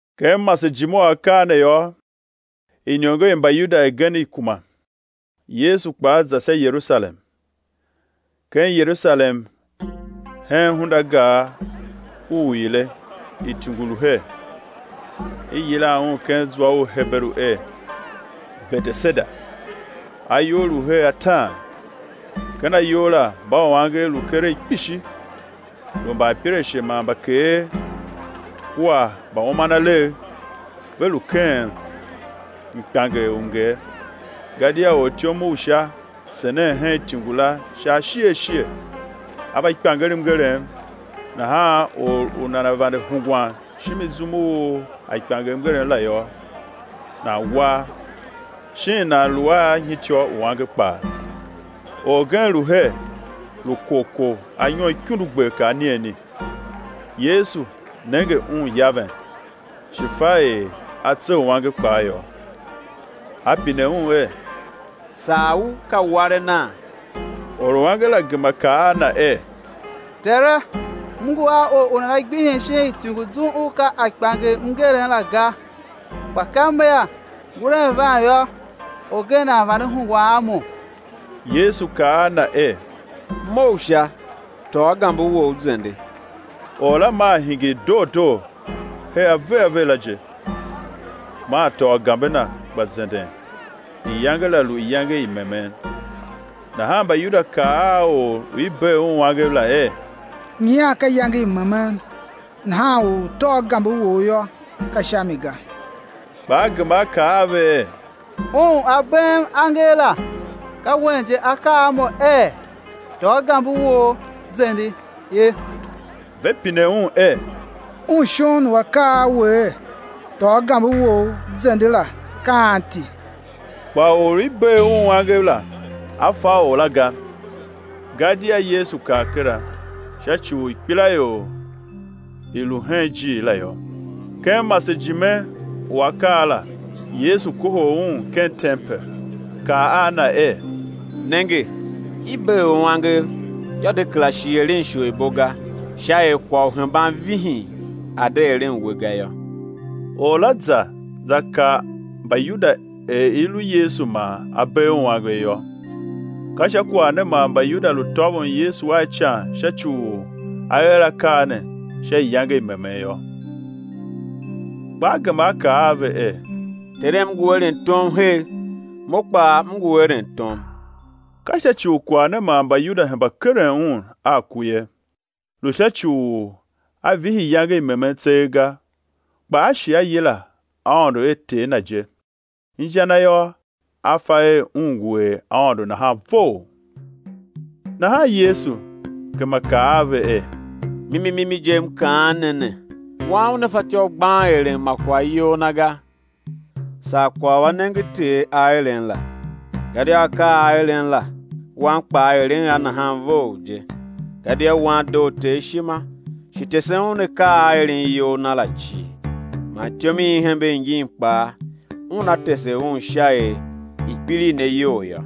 Ken masejime u akaa ne yô, iniongo i Mbayuda igen i kuma, Yesu kpaa za sha Yerusalem. Ken Yerusalem hen Hundagar u Uile ityungu lu her, i yilan un ken zwa u Heberu er Beteseda, ayou lu her ataan. Ken ayou la mbauangev lu keregh kpishi, lu mbaapirashe man mbakeer kua mbaumanalegh; [ve lu keghen mkpianger u mnger. Gadia ortyom u Sha senen hen ityungu la sha ashighe ashighe, a va kpianger mngerem; nahan or u nana vande hungwan shimi zum u a kpianger mngerem la yô, nan war shin nan lu a nyityô uange kpaa.] Orgen lu her, lu korkor anyom ikundugber kar anigheni. Yesu nenge un yaven, shi fa er a tse uange kpaa yô, A pine un er: Sar u ka warenaa? Oruange la gema kaa a Na er: Tere, m ngu a or u nana gbihim shin ityungu zum u ka a kpianger mngerem la ga; kpa ka mea nguren van yô, orgen nan vande hungwan a mo. Yesu kaa a na er: Mough sha, tôô gambe wou, zende. Or la maa hingir doo doo her aveghave la je, maa tôô gambe na, gba zenden. Iyange la lu iyange i memen. Nahan Mbayuda kaa a or u i bee un angev la er: Nyian ka iyange i memen, nahan u u tôô gambe wou yô, ka sha mi ga. Kpa a gema a kaa a ve er: Un u A beem angev la, ka wen je A kaa a mo er: Tôô gambe wou zende, ye. Ve pine un er: Un shon u A kaa a we er: Tôô gambe wou, zende, la, ka anti? Kpa or u i bee un angev la, a fa or la ga; gadia Yesu kar kera, sha ci u ikpelaior i lu hen ijiir la yô. Ken masejime u akaa la Yesu kohol un ken tempel, kaa a na er: Nenge, i bee u angev, yô, de kera shi eren isholibo ga sha er kwagh u hemban vihin a̱ de eren we ga yô. Or la za, za kaa Mbayuda er i lu Yesu man A bee un angev yô. Ka sha kwagh ne man Mbayuda lu tôvon Yesu a ican sha ci u A er akaa ne sha iyange i memen yô. Kpa A gema A kaa a ve er: Terem ngu eren tom her, Mo kpaa M ngu eren tom. Ka sha ci u kwagh ne man Mbayuda hemba keren Un a ku ye, lu sha ci u A vihi iyange i memen tseegh ga, kpa A shi A yila Aôndo er Ter Na je, inja na yô, A fa er Un ngu er Aôndo nahan vough. Nahan Yesu gema kaa a ve er: Mimi mimi je, M kaan ne ne, Wan Una fatyô u gban eren ma kwagh iyol Na ga, saa kwagh u A nenge Ter A eren la; gadia akaa a A eren la, Wan kpaa eren a nahan vough je. Gadia Wan doo Ter ishima, shi tesen Un akaa a A eren iyol Na la cii; man ityom i i hembe ingin kpaa Una tese Un sha er i̱ kpiligh ne iyol yô.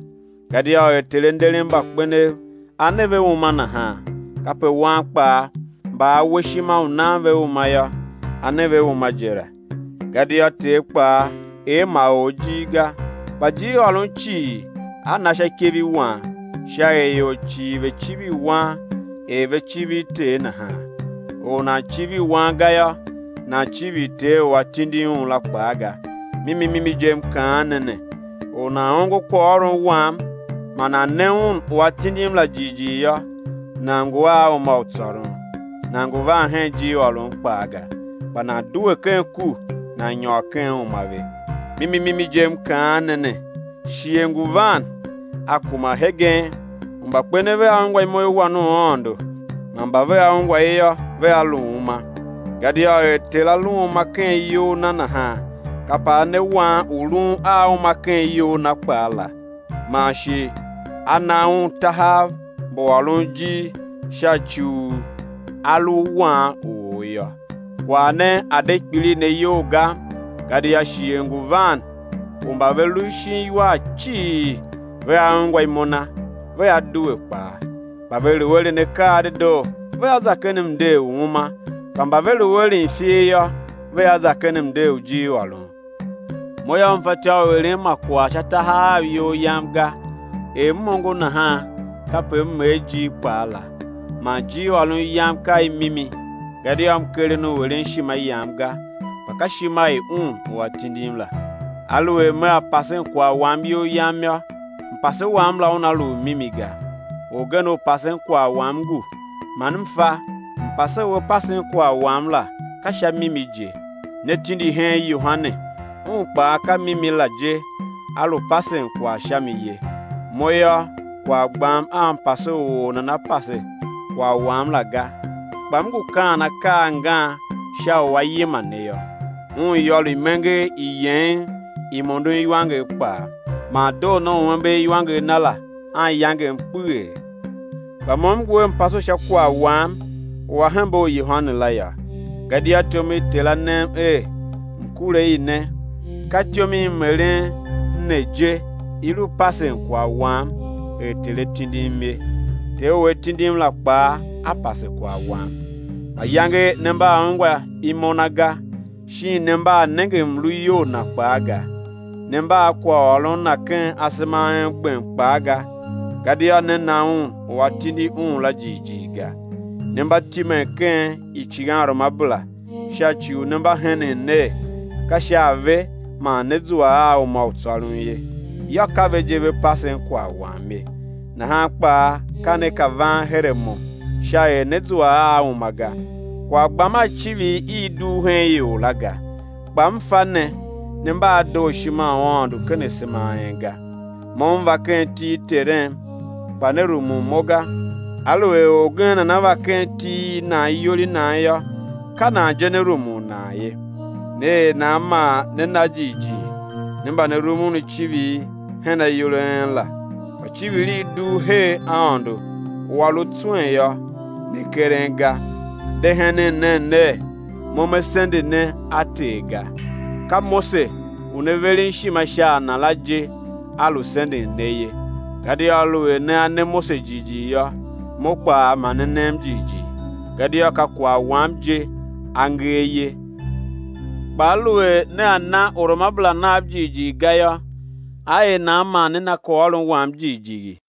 Gadia er Ter A nderen mbakpenev A ne ve uma nahan, kape Wan kpaa mba A we ishima u nan ve uma yô, A ne ve uma je la. Gadia Ter kpaa er ma or ijir ga, kpa ijirôron cii A na sha ikev i Wan, sha er ior cii ve̱ civir Wan er ve civir Ter nahan. Or u nan civir Wan ga yô, nan civir Ter u A tindi Un la kpaa ga. Mimi mimi je, M kaan ne ne, or u nan ongo kwaghôron Wam man nan ne Un u A tindim la jighjigh yô, nan ngu a uma u tsôron, nan ngu van hen ijirôron kpaa ga, kpa nan due ken ku, nan nyôr ken uma ve. Mimi mimi je M kaan ne ne, shighe ngu van, a kuma hegen, u mbakpenev vea ungwa imo i Wan u Aôndo, man mba vea ungwa i yô, vea lu uma. Gadia er Ter A lu a uma ken iyol Na nahan, kape A ne Wan u lun a uma ken iyol Na kpaa la. Man shi A na Un tahav mbu ôron ijir sha ci u A lu Wan u or yô. Kwagh ne a̱ de kpiligh ne iyol ga, gadia shighe ngu van u mba ve lu shin iwar cii vea ungwa imo Na, vea due kpaa; mba ve lu eren akaa a dedoo, vea za ken mnder u uma, kpa mba ve lu eren ifer yô, vea za ken mnder u ijirôron. Mo yô, M fatyô u eren ma kwagh sha tahav Av iyol Yam ga. Er M ongo nahan, kape M er ijir kpaa la; man ijirôron Yam ka i mimi, gadia M keren u eren ishima yam ga, kpa ka ishima i Un u A tindim la. Aluer Mea pasen kwagh Wam iyol Yam yô, mpase Wam la una lu u mimi ga. Orgen u pasen kwagh Wam ngu, man M fa, mpase u A pasen kwagh Wam la ka sha mimi je. Ne tindi hen Yohane, un kpaa ka mimi la je a lu pasen kwagh sha mi ye. Mo yô, kwagh gbam a mpase u or nana pase kwagh Wam la ga; kpa M ngu kaan akaa a angan sha u á yima ne yô. Un yô lu imenger i yeghen i mondon iwanger kpaa, man doo ne u ember iwanger na la anyangem kpeghee. Kpa Mo M ngu a mpase u sha kwagh Wam u a hembe u Yohane la yô; gadia ityom i Ter A nem er M̱ kure i ne, ka ityom i M eren i ne je i lu pasen kwagh Wam er Ter A tindim ye. Ter u A tindim la kpaa A pase kwagh Wam. Mayange ne mba a ungwa imo Na ga, shin ne mba a nenge mluyol Na kpaa ga. Ne mba a kwaghôron Na ken asema a en gbem kpaa ga, gadia ne na Un u A tindi Un la jighjigh ga. Ne mba timen ken icighanruamabera sha ci u ne mba henen ner, ka sha a ve man né zua a uma u tsôron ye; yô, ka ve je ve pasen kwaghwam ye. Nahan kpaa ka ne ka van her a Mo sha er ne̱ zua a uma ga. Kwagh gbam a civir i i dugh hen ior la ga. Kpa M fa ne, ne mba a dooshima u Aôndo ken asema a en ga. Mo M va ken iti i Terem, kpa ne rumun Mo ga; aluer orgen nana va ken iti i nan iyol i nan yô, ka nan je né rumun nan ye. Ne er nan man ne na jighjigh, ne mba ne rumun icivir i her ayol a en la, kpa icivir i i dugh her Aôndo u A lu tswen yô, ne keren ga? De henen nen ner, Mo Me sende ne a Ter ga; ka Mose u ne veren ishima sha a na la je a lu senden ne ye. Gadia aluer nea ne Mose jighjigh yô, Mo kpaa ma ne nem jighjigh gadia ka kwagh Wam je a nger ye. Kpa aluer nea na uruamabera nav jighjigh ga yô, á er nan man né na kwaghôron Wam jighjigh?